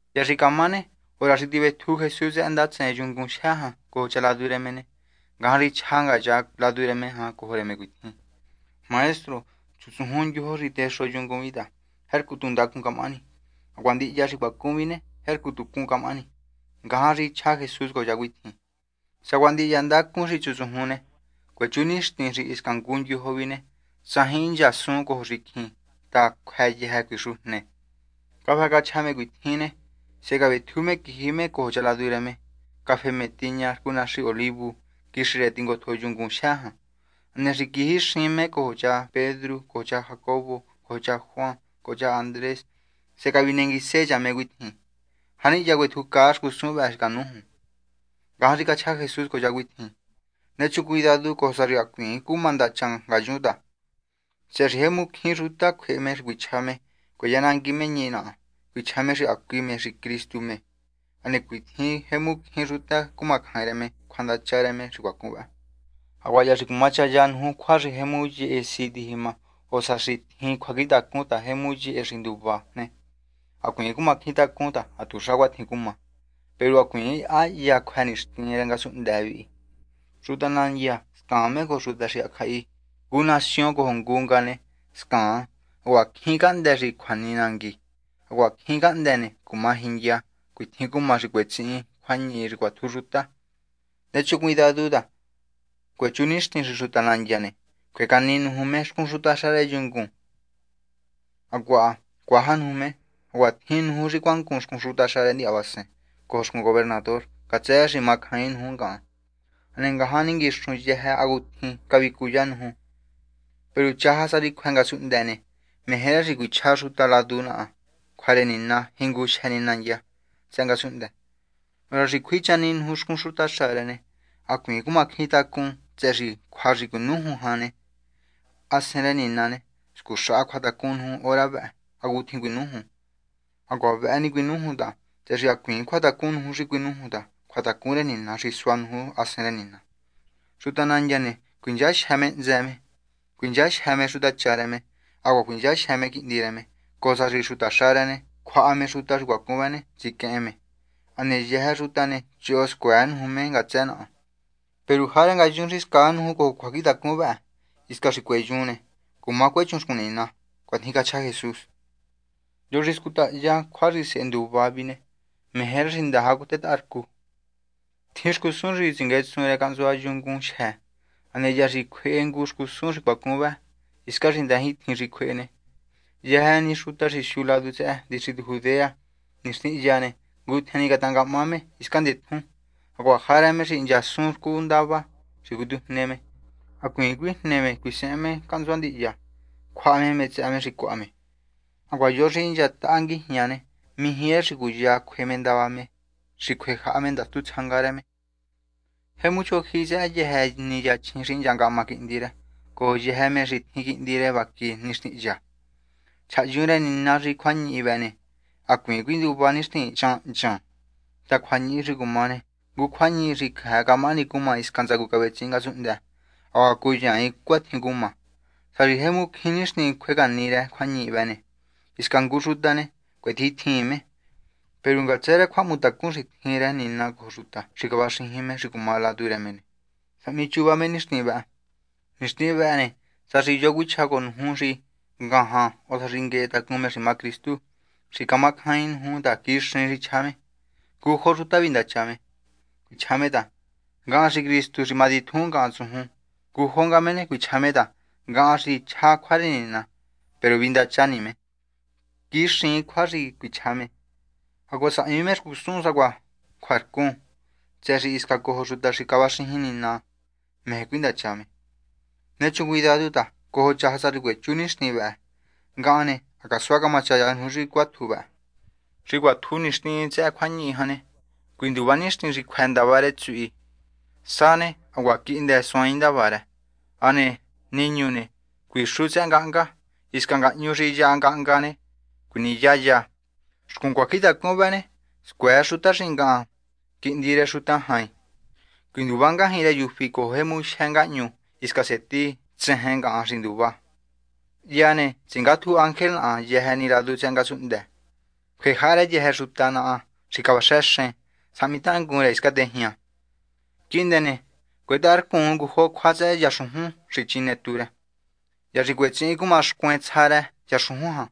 Hya xi camá ne, hora xi tivetju Jesús tsëhë ndatsen yungun xi matitjun jan cojo cha ladu rë me ne, ngajan xi chja nga cha ladu rë me jan cojo rë me cuitjin: ―Maestro, chutsujun ndyojo xi texo yungun vihi ta tjercu tu ndacun camahani. Hacuaha ndihya tsëhë ne, jercu tu cun camahani. Ngajan xi chja Jesús cojo cha cuitjin: ―Sacuaha ndihya ndacun xi chutsujun ne, cuechu nixtin xi hisca xi ngu ndyojo vi ne, tsajin hinchasuncoo xicjin ta, cjuë yëjë cuixujne. Cafë cachja me cuitjin ne, sehe cavetju me quiji me cojo cha ladu rë me, cafehe me tiña rcu Naxi Olivu, quixi rë tingotjo yungun xi matitjun jan. Hane xi quijixin me cojo cha Pedru cojo cha Jacobo cojo cha Juan cojo cha Andrés, sehe cavinenguise cha me cuitjin: ―¿Janihya cuetjucaa xcusun vëhë xi canújun? Ngajan xi cachja Jesús cojo cha cuitjin: ―Nechun cuidadu cojo sa xi hacuiin cuma ndacha ngayun ta, tsëhë xi jemu cjín xuta cjuehe me xi cuichja me cueyanangui me ñihi naha cuichja me xi hacui me xi Cristu me. Hane cuatjin jemu cjín xuta cumacjain rë me cjuandacha rë me xi cuacun vë. ’Hacuaha hya xi cumachaya nuju cjua xi jemu yehe si tijima ne o sá xi tjin cjuacjintacun ta jemu yehe si nduva ne, hacuiin cumacjintacun ta ha tuxa cuatjin cuma. Peru hacuiin ha hya cjuë nixtin rë ngasunhndë vihi. Xuta nandya scaan cojo xuta xi hacjahi. Ngu nación cojo ngu nga ne, scaan. Hacuaha cjín cahndë́ xi cjuani nangui. Hacuaha cjín cahndë́ ne, cuma jindya. Cuatjin cumá xi cuetsihin cjuañihi xi cuatju xuta. ’Nechun cuidadu ta, cuechu nixtin xi xuta nandya ne, cjue cani nuju me xcun xutaxa rë yungun ne, hacuaha cuaja nuju me. Hacuaha tjin nuju xi cuangun xcun xutaxa rë ndihyavasen cojo xcun gobernador ngatsë rë xi macjain nuju ngahan. Hane ngajan ninguixun yëjë cjua hacutjin cavicuyá nuju. Peru chaja sa xi cjuë ngasunhndë ne, meje rë xi cuichja xuta ladu naha cjua rë Nina jingujyë ni nandya tsëhë ngasunhndë. Hora xi cjui chani nuju xcun xutaxa rë ne, hacuiin cumacjintacun tsëhë cjua xi cuinújun jan ta, Hasen rë Nina ne, scuxaha cjuatacun nuju hora vëhë hacutjin cuinújun. Hacuaha vëhë ni cuinújun ta tsëhë xi hacuiin cjuatacun nuju xi cuinújun ta cjuatacun rë Nina xi sua nuju Hasen rë Nina. Xuta nandya ne, cuinchajyë me hntsë me, cuinchajyë me xutacha rë me, hacuaha cuinchajyë me quihndi rë me, cojo sa xi xutaxa rë ne, cjuaha me xuta xi cuacun vë ne, tsiquehen me. Hane yëjë xuta ne, choho scuëë nuju me ngatsë naha. Peru jarë ngayun xi scaa nuju cojo cjuacjintacun vëhë hisca xi cueyun ne, cuechun xcun Nina. ―Cuatjin cachja Jesús. ’Yo xi scutaya cjua xi sehe nduva vi ne, meje rë xi ndaja catetaharcun. Tjin xcusun xi tsinguetsun rë cahntsua yungun xi matitjun. Hane hya xi cjuehe ngu xcusun xi cuacun vë hiscan xi ndajintjin xi cjuehe ne, yëjë ni xuta xi siu ladu tsëhë distritu Judea nixtin hya ne, ngutjen ni catangahma me hiscan ndetjun. Hacuaha jarë me xi hinchasun rcu ndava xi cuitujne me, hacuiin cuijne me xi cuisehen me cahntsua ndihya cjuaha me mé tsëhë me xi cjuaha me. Hacuaha yo xi hinchataha me nguijña ne, mijí rë xi cuya cjue me ndava me xi cjuejaha ndastu tsjanga rë. Jemu chojyihi tsëhë yëjë ni yachjin xi hinchahma quihndi rë cojo yëjë me xi tjin rë quihndi vaqui ne nixtin hya. Chjahyun rë Nina xi cjuañihi vëhë ne, hacuiin cuinduva nixtin chan hnchan ta, cjuañihi xi cuma ne, ngu cjuañihi jyë xi cjëë camahani cumá hisca ntsacu cavetsihin ngasunhndë hacuaha cuyaain cuatjin cuma. Sá xi jemu cjín nixtin cjuecani rë cjuañihi vëhë ne, hisca ngu xuta ne, cuetjintjiin me. Peru ngatsë rë cjuahmutacun xi tjin rë Nina cojo xuta xi cavaxijin me xi cumá me ladu rë me ne, sahmichuva me nixtin vëhë. ’Nixtin vëhë ne, sá xi yo xi cuichja cojo nuju xi ngajan o sá xi nguehe tacun me xi má Cristu, xi camacjaain nuju ta quixiin xi chja me. Ngujo xuta vindacha ne, cuichja me ta: “Ngahan xi Cristu xi cumatitjun ngahan tsujun.” Ngujo nga me ne, cuichja me ta: “Ngahan xi chjá cjua rë Nina.” Peru vindacha ni me, quixiin cjua xi cuichja me. Hacuaha sahmi me xcusun sacuaha cjuarcun, tsëhë xi hisca cojo xuta xi cavaxijin Nina meje cuindacha me. Nechun cuidadu ta cojo chaja sa xi cuechu nixtin vëhë ne, ngahan ne, ha casua camachaya nuju xi cuatju vë. ’Xi cuatjun nixtin tsëhë cjuañihi jan ne, cuinduva nixtin xi cjuë ndavá rë tsuhi. Sá ne, hacuaha ha quihndë suaain ndavá rë. Hane niñu ne, cuixu tsëhë ngahnga. Hisca ngahñu xi yaha ngahnga ne, cjuiniyaya. Xcun cjuacjintacun vëhë ne, scuëë xuta xi ngahan, Quihndi rë Xuta Jain, cuinduvá ngajñi rë yufí cojo jemu jyë ngahñu hisca seti tsejen ngahan xi nduvá. Hya ne, tsingátju ángel naha yëjë ni ladu tsëhë ngasunhndë, cjuejaha rë yëjë xuta naha xi cavaxejen, sahmi tangun rë hiscan tejña. ’Quihndë ne, cuetaharcun ngujo cjua tsëhë yaxujun xi chine tú rë. Hya xi cuetsihin cumá xcuen tsja rë yaxujun jan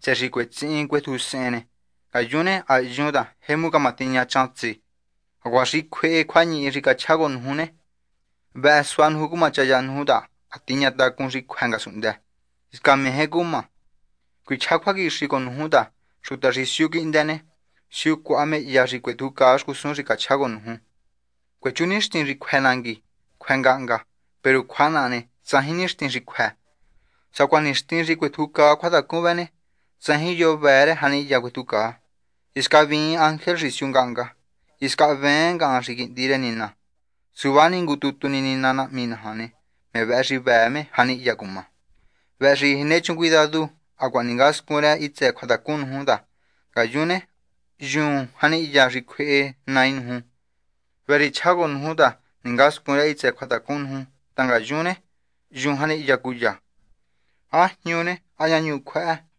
tsëhë xi cuetsihin cuetjusehen ne, ngayun ne ha hyun ta ha jemu camatiña chan tsi. Hacuaha xi cjuehe cjuañihi xi cachjá cojo nuju ne, vëhë sua cumachaya nuju ta ha tiña tacun xi cjuë ngasunhndë, hisca meje cumá. Cuichjá cjuaquixi cojo nuju ta xuta xi siu quihndë ne, siu cuaha me hya xi cuetjucaa xcusun xi cachjá cojo nuju. Cuechu nixtin xi cjuë nangui, cjuë ngahnga. Peru cjua naha ne, tsajin nixtin xi cjuë. ’Sacuaha nixtin xi cuetjucaa cjuatacun vëhë ne, tsajin yo vëë rë janihya cuetjucaa. Hisca hvíin ángel xi siu ngahnga. Hisca hveen ngahan xi Quihndi rë Nina. Suva ni Nina ngu tutu nahmi naja ne, me vëhë xi vëë me janihya cumá. ’Vëhë xi nechun cuidadu, hacuaha ningascun rë hitsë cjuatacun nuju ta, ngayun ne, hyuun janihya xi cjuehe Nai nuju. Vëhë xi chjá cojo nuju ta ningascun rë hitsë cjuatacun nuju ta ngayun ne, hyuun janihya cúya, ¿há jñu ne?, ¿há ñahñu cjuëhë?